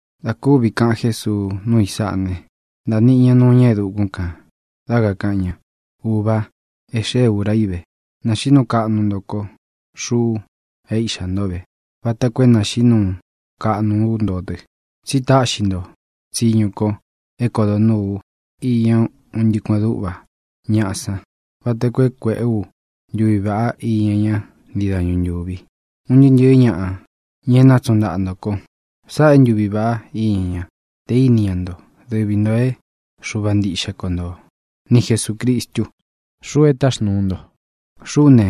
Dā kúvi kaꞌan Jésuu núu i sáꞌa ne, ntāa niꞌi ña nuu ñá e dukún kān, dá kakāꞌan ña: —Ūva, e xée ūra í ve. Nāxiꞌí nuu kaꞌnu nto kó, xuꞌu é Iꞌxā ntó ve, vata koo é nāxiꞌí nuu kaꞌnu ú nto dɨ. Tsi táꞌxi nto tsiñu ko é kodo nūú u iña un ntɨꞌɨ kueꞌen dúꞌva ñaꞌa san vata koo é kuēꞌé u ntuví vaꞌá iña ña ntii dañu ntúvi, un ntɨɨ́ ntɨ̄ɨ́ ñaꞌa, ña e nátsuꞌun ntaꞌa nto ko. Sáꞌā é ntuvi vāꞌá iña ña: te īni ñá nto, dɨvi ntō é Xuva ntiꞌxe ko nto, ni Jesūcristu, xuꞌu e táxnūu nto. ʼXuꞌú ne,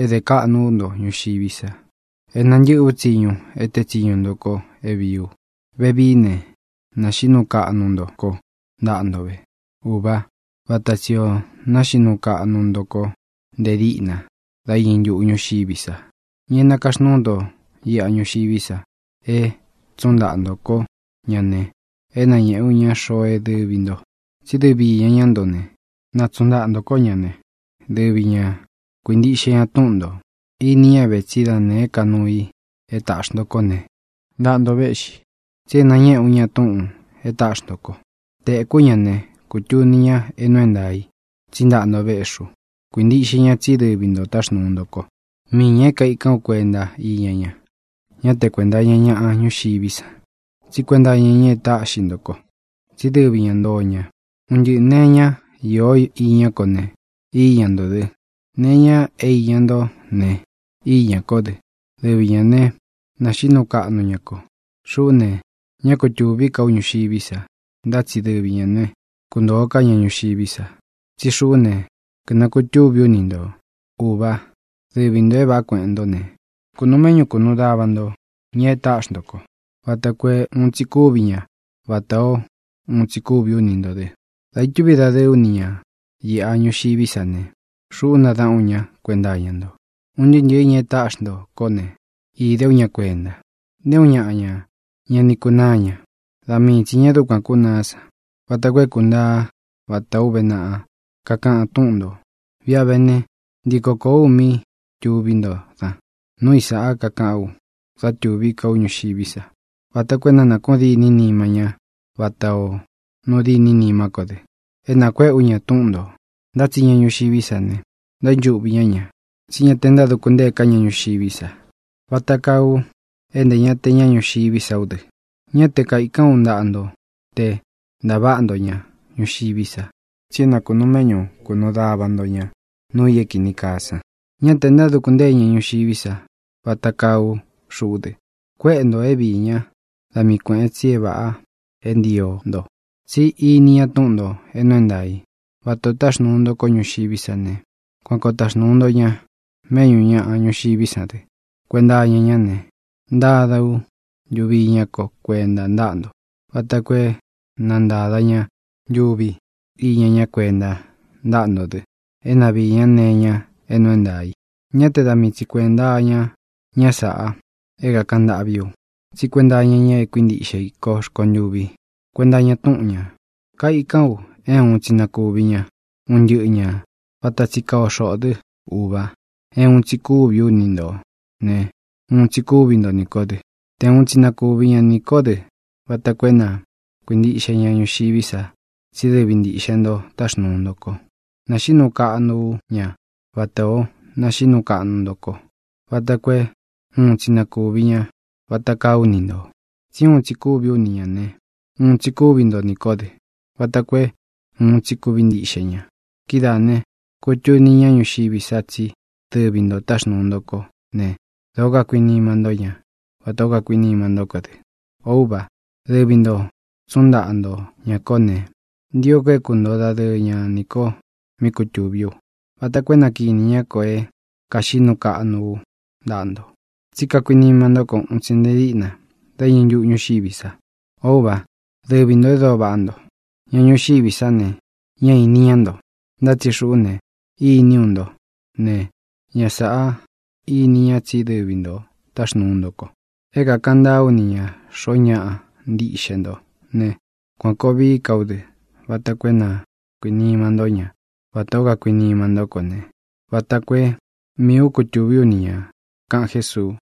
é dē kaꞌnu ú nto ñuxiví sa. É nantɨ́ꞌɨ u tsiñu e teé tsiñu nto ko é vīí u. Vevií ne, naxiꞌí nuu kaꞌnu nto kó ntaꞌa nto ve, Ūvá, vata tsī o náxiꞌí nuu kaꞌnu nto kó ntē díꞌna dá iñɨ ntuꞌu ñúxiví sa. ʼÑa é nakaxnúu nto iꞌa ñuxiví sa é tsuꞌun ntaꞌa ntō kó ña ne, é nañēꞌé u ña xoo é dɨvi ntō. Tsí dɨvi īña ntó ña ne, nátsuꞌun ntaꞌa ntō kó ña ne, dɨvi ñā kuíntiꞌxe ña túꞌun ntō. Ini ñá ve tsí da nēé ka nuu i e táꞌxi nto kó ne, ntaꞌa nto véꞌxi. Tsi é nañéꞌe ú ña túꞌūn e táꞌxi nto ko. Tēkú ña ne, kutuni ña é nuu é ntaā i tsí ntaꞌa nto véꞌxi u. Kuīntiꞌxe ña tsí dɨvi ntō táxnūu nto ko. ʼMiī ña é kaikán u kuenta iña ña. Ñá te kuēnta iña ñá ñuxiví san, tsí kuenta iña ña e táꞌxi nto ko, tsí dɨvi īña nto ña. Un ntɨꞌɨ̄ nee iñá īó iñá ko ne, íña ntō dɨ; nee iña é īña ntó ne, íñā kó dɨ. Dɨvi ñā ne, náxiꞌí nuu kaꞌnu ña ko. ʼXuꞌú ne, ñá kutūví ka ú ñuxiví sa, ntá tsi dɨvi ñā né, kuntōo ká ña ñuxiví sa. Tsí xuꞌú ne, kɨ̄nakutúvī ú ni ntō. Ūvá, dɨvi ntō é vāꞌá kueꞌen nto ne, kūnuu méꞌñu kunuu dava nto ña e táꞌxi nto ko vata koo é uun tsi kuvi ña vatā ó uun tsi kúvī ú ni ntō dɨ. Dā itúvi dadɨɨ ú ni ñā iꞌa ñuxiví sa ne, xuꞌú nadaꞌan ú ña kuenta iña ntó, un ntɨɨ́ ntɨɨ̄ ña e táꞌxi nto kó ne, īde ú ña kuenta. Nté uun ñaꞌa ña ña ni kunáa ña (da mii tsi ñā e dúkuan kúnaá san), vata koo é kuntaa vatā ó uve naꞌa kakaꞌan túꞌun ntō. ʼViꞌi a vé ne, ntiko kōó u mí tuví nto dan. Núu i sāꞌá kakaꞌán u da tuví ka u ñuxiví sa vata koo é na nākuꞌun dîni nima ñá vatā ó nuu dîni nimá ko dɨ. É nakuéꞌe ú ña túꞌun ntō. Ntá tsi ña ñuxiví sa ne, ntaínchuꞌvi ñá ña, tsí ña te ntáduku ntée ká ña ñuxiví sa vata kaa u é ntē ña te ña ñuxiví sa ú dɨ. Ñá te kaīkán u ntaꞌa nto te natavā ntó ña ñuxiví sa, tsi é na kūnuu méꞌñu kunuu dava nto ña nuu i é kīni kaa san. Ñá te ntáduku ntée ña ñuxiví sa, vata kaa ú xuꞌú dɨ. Kuéꞌe ntō é viī ñá da mii kuēꞌen tsi é vāꞌa é ntio nto, tsí ini ña túꞌun ntō é nuu é ntaā i. Vata ō táxnuu nto kó ñuxiví sa ne, kuan koo taxnūu ú ña méꞌñū ña ñuxiví sa dɨ. Kuenta iña ñá ne, ntada ú ntuvi iñá ko kuenta ntáꞌa nto vata koo é na ntāda ña ntuvi iña ña kuénta ntáꞌa nto dɨ é na viī ñá nee iña é nuu é ntaā i. ʼÑá te da mii tsi kuēnta iña ña sáꞌa é kākaꞌan ntâꞌví u, tsí kuenta iña ña é kuintiꞌxe i ko rkontûvi kuenta iña túꞌun ñā. Kaikan u é uun tsi na kūvi ña, un ntɨ́ꞌɨ ñā, vata tsi kaa o xoꞌō dɨ́, Ūva, é uun tsi kúvī ú ni ntō ne, uun tsi kúvi nto nī kó dɨ. Te uun tsi na kuvi ña ni kō dɨ vata koo é na kuīntiꞌxe ña ñuxiví sa tsí dɨvi ntiꞌxe ntō táxnuu nto ko. Naxiꞌí nuu kaꞌnu ú ña vatā ó naxiꞌí nuu kaꞌnu nto kó vata koo é uun tsi na kūvi ña vata kaa ú ni ntō. Tsi úun tsi kúvī ú ni ñā ne, uun tsi kúvi nto nī kó dɨ, vata koo é uun tsi kuvi ntiꞌxe ña. Kidáā ne, kutuni ñá ñuxiví sa tsí dɨvi ntō táxnuu nto kó ne, dōó kakuinima ntó ña vatā ó kakuinima ntó ko dɨ. ʼŌ Úva, dɨvi ntō tsúꞌun ntaꞌa nto ñā kó ne, ntio ko é kuntoo dadɨɨ ña nī ko mí kutūví u, vata koo é na kinī ñá ko é kāxiꞌí nuu kaꞌnu ú ntaꞌa nto. Tsí kakuinima ntó ko un tsi nte díꞌna dá iñɨ ntuꞌu ñúxiví sa. Ō Úva, dɨvi ntō e dóo vaꞌá nto. Ña ñuxiví sa ne, ñá īni ñá nto. Ntá tsi xuꞌú ne, iní u nto ne, ña sāꞌá ini ñá tsí dɨvi ntō táxnūu nto ko. É kākaꞌan ntaa ú ni ñā xoo ñáꞌa ntiꞌxe nto ne, kuan kōo vií ka ú dɨ vata koo é na kuīnima ntó ña vatā ó kakuinima ntó ko ne, vata koo é miī ú kutūví u ni ñā —kaꞌan Jésuu.